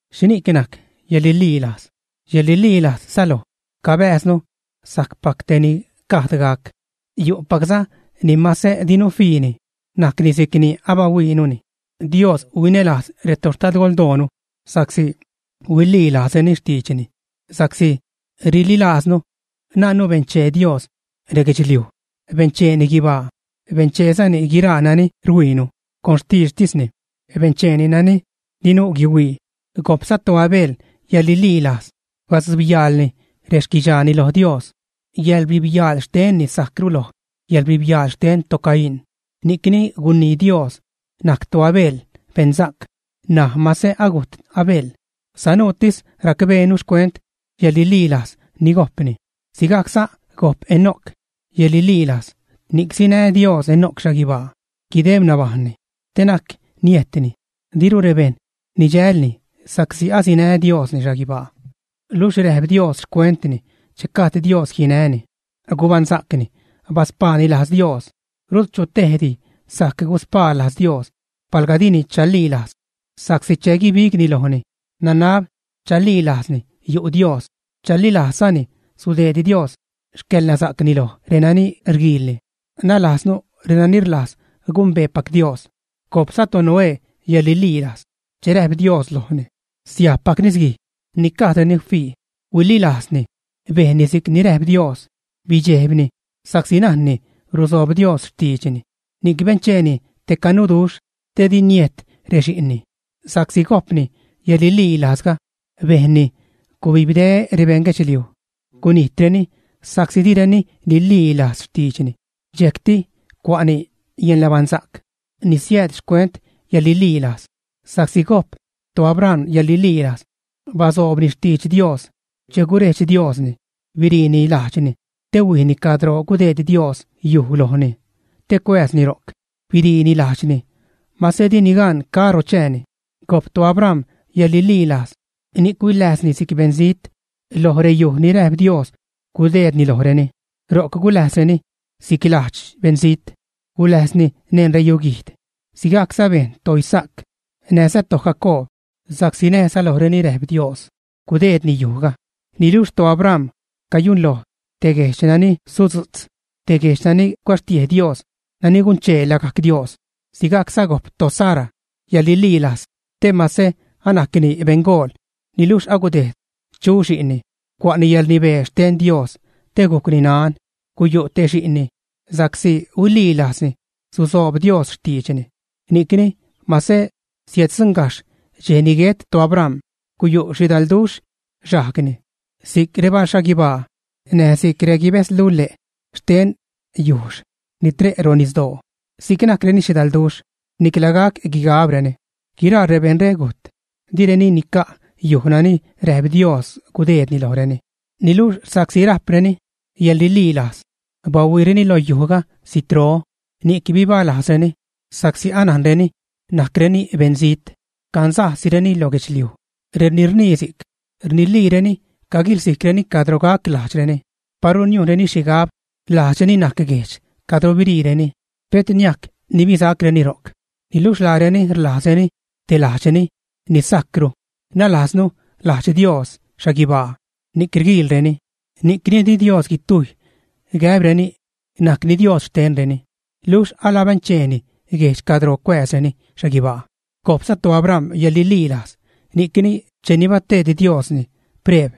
¿Xhini'c najc yäḻrililajz? Yäḻrililajz säloj cabääznu sajcpac tejni gajd gac, yu'pacza ni mase dinu fiini, najcni si'cni abahuiinuni. Dios huinälajz retoxtadgoldoonu sa'csi huililajzreni xtiidxni. Sa'csi rililajznu, najnnu benchee Dios reguedxliuj, bencheeni guibaa, bencheezani guiraa nani rhuiinu. Con xtiidxtisni bencheeni nani dinu guihuii. Gojpza toAbel yäḻrililajz badzubyaalni rexquidxaani lo Dios. Yäḻrbijbyaal xtenni sajcru loj yäḻrbibyaal xten toCaín. Ni'cni gunii Dios najc toAbel beṉsa'c. N̲aj mase agujt Abel, sanuutis racbeenu xcuent yäḻrililajz ni gojpni. Sigajcza gojp Enoc yäḻrililajz, ni'c sinä Dios Enoc xhaguibaa, guideb nabajṉni, te na'c niejtni. Diru rebejṉ nidxälni sa'csi asinä Diosni xhaguibaa. Luxh räjp Dios xcuentni che gajd Dios jinäni, gubaṉsa'cni, baspaani lajz Dios. Rut chu tejdi sajc guspaa lajz Dios palga dini chalilajz, sa'csi che guibigni lojni, nanab chalilajzni yu' Dios, chalilajzzani sudeed Dios xcäḻnasa'cni loj renani rguiilni, nalajznu renani rlajz gumbeepac Dios. Gojpza toNoé yäḻrililajz. Che räjp Dios lojni siajbpac nisguij ni gajdreni fii, huililajzni. Bejnni si'c ni räjp Dios. Bidxejbni sa'csi najni rusoob Dios xtiidxni, ni'c bencheeni te canuduxh te di niejt rexi'nni. Sa'csi gojpni yäḻrililajzga, bejnni gubibde rebejṉ guedxliuj, gunijtreni sa'csi direni nililajz xtiidxni. Dxejcti cua'ni yäḻnabaṉsa'c ni siääd xcuent yäḻrililajz. Sa'csi gojp toAbram yäḻrililajz, basoobni xtidx Dios che gurejdx Diosni, biriini lajdxni te huijni cadro gudeed Dios yuj lojni te cuääzni ro'c. Biriini lajdxni, mase dini gan caro chääni. Gojp toAbram yäḻrililajz, ni'c huiläjzni si'c beṉzijt loj reyuj ni räjp Dios gudeedni lojreni. Ro'c guläjzreni si'c lajdx beṉzijt. Guläjzni neṉ reyuguijd, sigajcza bejn toIsaac näjza toJacoob, sa'csi näjza lojreni räjp Dios gudeedni yujga. Niluxh toAbram cayunloj te guejdx nani sudzu'tz, te guejdx nani cuäxtiej Dios, nani gunchee lagajc Dios. Sigajcza gojp toSara yäḻrililajz te mase anajcni beṉgool niluxh agudejd chu xi'nni, cua'ni yäḻrnibee xten Dios te gujcni nan, guyu' te xi'nni, sa'csi huililajzni susoob Dios xtiidxni. Ni'cni mase siäddzuṉgajxh dxej ni guet toAbram, guyu' xhidalduxh xajgni. Si'c rebalxhaguibaa näj si'c reguibäzlule' xten yujxh ni tre' ro' nisdoo, si'c najcreni xhidalduxh, nicla gac guigabreni. Guiraa rebejṉre gujt, direni nica' yuj nani räjp Dios gudeedni lojreni; niluxh sa'csi rajpreni yäḻrililajz, bahuiireni lo yujga zitro, ni'c bibalajzreni, sa'csi anajreni najcreni beṉzijt, cansajsireni lo guedxliuj. Reni rnii si'c, rniliireni caguilsijcreni cadro gac lajdxreni. Paru niujnreni xhigab lajdxreni najc guejdx cadro biriireni, pet niajc nibisacreni ro'c. Niluxh laareni rlajzreni te lajdxreni ni sajcru, nalajznu lajdx Dios xhaguibaa, ni'c rguiilreni. Ni'cni di Dios guitujy gäbreni najcni Dios xtenreni, luxh alabencheeni guejdx cadro cuääzreni xhaguibaa. Gojpza toAbram yäḻrililajz ni'cni cheni bateed Diosni preeb,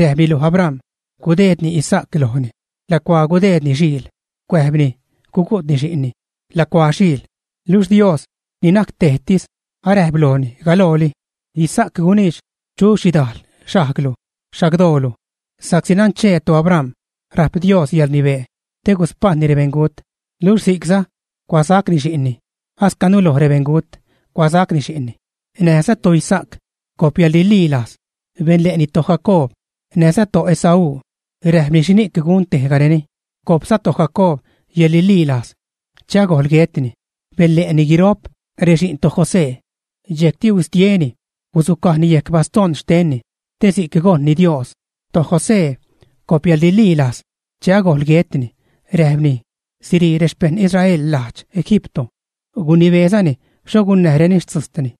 räjpni loj Abram gudeedni Isaac lojni lacuaa gudeedni xhiil, cuäjbni gugu'tni xi'nni lacuaa xhiil, luxh Dios ni najc tejtis aräjp lojni galooli: “Isaac guniidx chu xhidajl xajglu, xagdoolu.” Sa'csi nanchee toAbram rajp Dios yäḻrnibee te guspajṉni rebeṉgut. Luxh si'cza cuasacni xi'nni, ascanu loj rebeṉgut cuasacni xi'nni. Näjza toIsaac gojp yäḻrililajz benle'ni toJacoob näjza toEsaú, räjpni xhini'c gun tejgareni. Gojpza toJacoob yäḻrililajz, che agojl guetni, benle'ni guiro'p rexi'n toJosé. Dxejcti huistieni guzucajni yejc bastoṉ xtenni te si'c gojṉni Dios. ToJosé gojp yäḻrililajz. Che agojl guetni, räjpni sirii rexpejṉ Israel lajdx Egipto, gunibeezani xho gunnäjreni xtzujtni.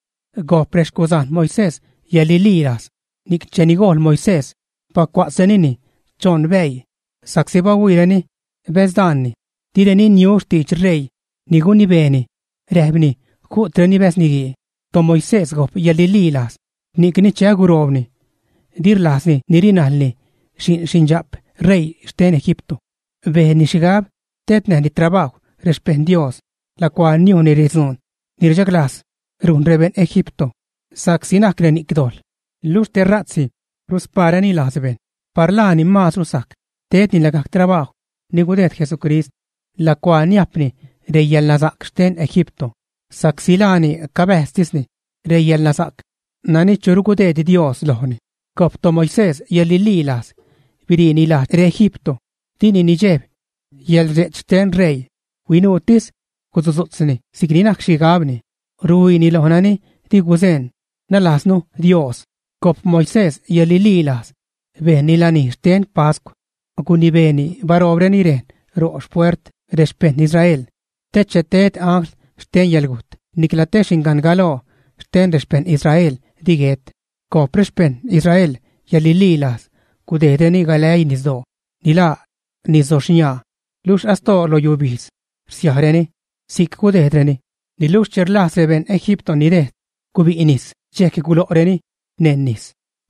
Gojp rexcuzajn Moisés yäḻrililajz, ni'c cheni gojḻ Moisés, bacua'tzrenini choṉ bäii, sa'csi bahuiireni bäzdaanni. Direni niu xtidx ṟeii ni gunibeeni, räjpni ju'treni bäz niguii. ToMoisés gojp yäḻrililajz, ni'cni che aguroobni di rlajzni nirilajni xi'n xindxa'p ṟeii xten Egipto. Bejnni xhigab tednäjni trabajw rexpejṉ Dios lacuaa niujnni redzuun ni rchaglajz rujn rebeṉ Egipto, sa'csi najc reni'c dojḻ, luxh tera'tsi ruspaareni lajz bejṉ. Par laani maazru sajc tedni lagajc trabajw ni gudejd Jesucrist lacuaa niajpni reyäḻnasa'c xten Egipto sa'csi laani cabäjztisni reyäḻnasa'c nani churu gudeed Dios lojni. Gojp toMoisés yäḻrililajz biriini lajdx reEgipto, dini nidxejb yäḻrdxe'ch xten ṟeii, huinuutis gusudzu'tzni si'cni najc xhigabni, ruhuiini loj nani di guzeṉ, nalajznu Dios. Gojp Moisés yäḻrililajz bejnni lanij xten pascw. Gunibeeni baroobreni rejn ro' xpuert rexpejṉ Israel te che ted angl xten yäḻgujt nicla te xingan galoo xten rexpejṉ Israel di guet. Gojp rexpejṉ Israel yäḻrililajz gudejdreni galäii nisdoo ni laa nisdoxniaa luxh asdoo loj yubijdz rsiajreni si'c gudejdreni. Niluxh che rlajz rebejṉ Egipto nidejd, gubi' nis, dxejc gulo'reni neṉ nis.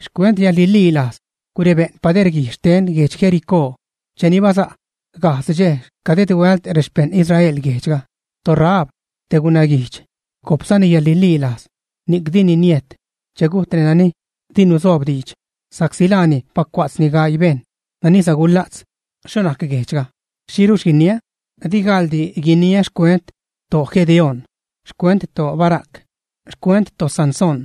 Xcuent yäḻrililajz gurebä'n paderguij xten guedx Jericó, cheni basa' gajdz dxej caded huält rexpejṉ Israel guejdxga. ToRahab, te gunaguijdx, gojpzani yäḻrililajz ni'c dini niejt che gujt renani di nuzobdiidx, sa'csi laani bacua'tzni gaii bejṉ nani sagula'tz xho najc guejdxga. ¿Xhiruxh guiniä? Di gaḻdi guiniä xcuent toGedeón, xcuent toBarac, xcuent toSansón,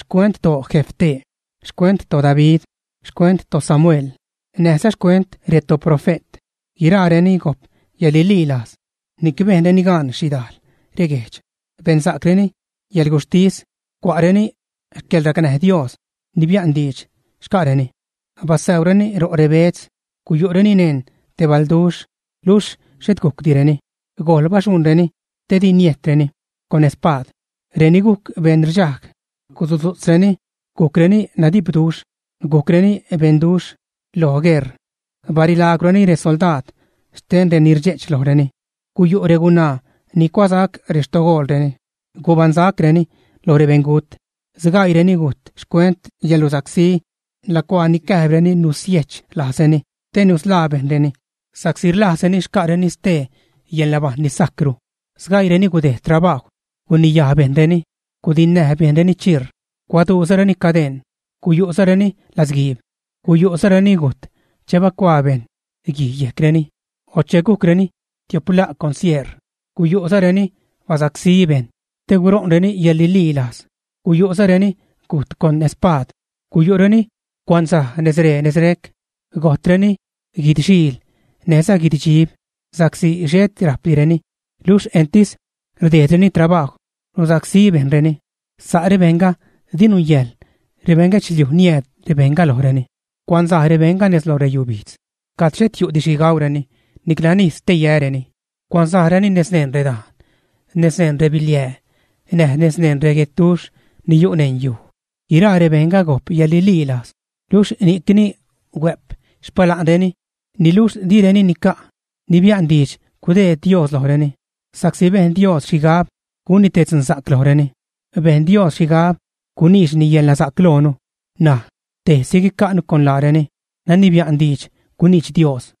xcuent toJefté, xcuent toDavid, xcuent toSamuel, näjza xcuent retoprofe't. Guiraareni gojp yäḻrililajz ni'c bejnreni gaan xhidajl reguejdx, bensa'creni yäḻguxhtis, cua'reni xcäḻracnäj Dios ni bia'n diidx xca'reni, basäureni ro' rebeedz. Guyu'reni neṉ te balduxh luxh xhet gujcdireni, gojl baxuṉreni te di niejtreni con espaad. Reni gujc beṉrdxajg, guzutzu'tzreni gujcreni nadipduxh, gujcreni beṉduxh lo gueṟ, barilaagwreni resoldaad xten reni rdxe'ch lojreni. Guyu' regunaa ni cuasac rextogoolreni, gubaṉsacreni lo rebeṉgut. Sgaiireni gujt xcuent yäḻrusacsí lacuaa nicäjbreni nusiech lajzreni te nusḻaa bejṉreni sa'csi rlajzreni xca'reni stee yäḻnabajṉ ni sajcru. Sgaiireni gudejd trabajw guniyaj bejṉreni, gudinnäj bejṉreni chiir, cuaduuzareni cadeṉ, guyu'zareni latzguiib. Guyu'za reni gujt che bacuaa bejṉ guij yejcreni o che gujcreni tio'p la' con sieṟ. Guyu'za reni basacsí bejṉ te guṟo'nreni yäḻrililajz. Guyu'za reni gujt con spaad. Guyu' reni cuanzaj nezree nezrec, gojtreni guid-xiil näjza guid-dxib, sa'csi xhet rajpdireni luxh entis rdejdreni trabajw rusacsí bejṉreni. Sa' rebejṉga di nungäjḻ rebeṉ guedxliuj niääd rebejṉga lojreni. Cuanzaj rebejṉga nez lo reyubijdz cad xhet yu'di xhi gaureni nicla nis te yäreni; cuanzajreni nez neṉ redajn, nez neṉ rebiliää näj nez neṉ guedduxh ni yu' neṉ yuj. Guiraa rebejṉga gojp yäḻrililajz, luxh ni'cni huä'p xpala'nreni, niluxh direni nica' ni bia'n diidx gudeed Dios lojreni, sa'csi bejn Dios xhigab gunni te dzunsa'c lojreni. Bejn Dios xhigab guniidxni yälnasa'c loonu, ṉaj tejsi guica'nu con laareni nani bia'n diidx guniidx Dios.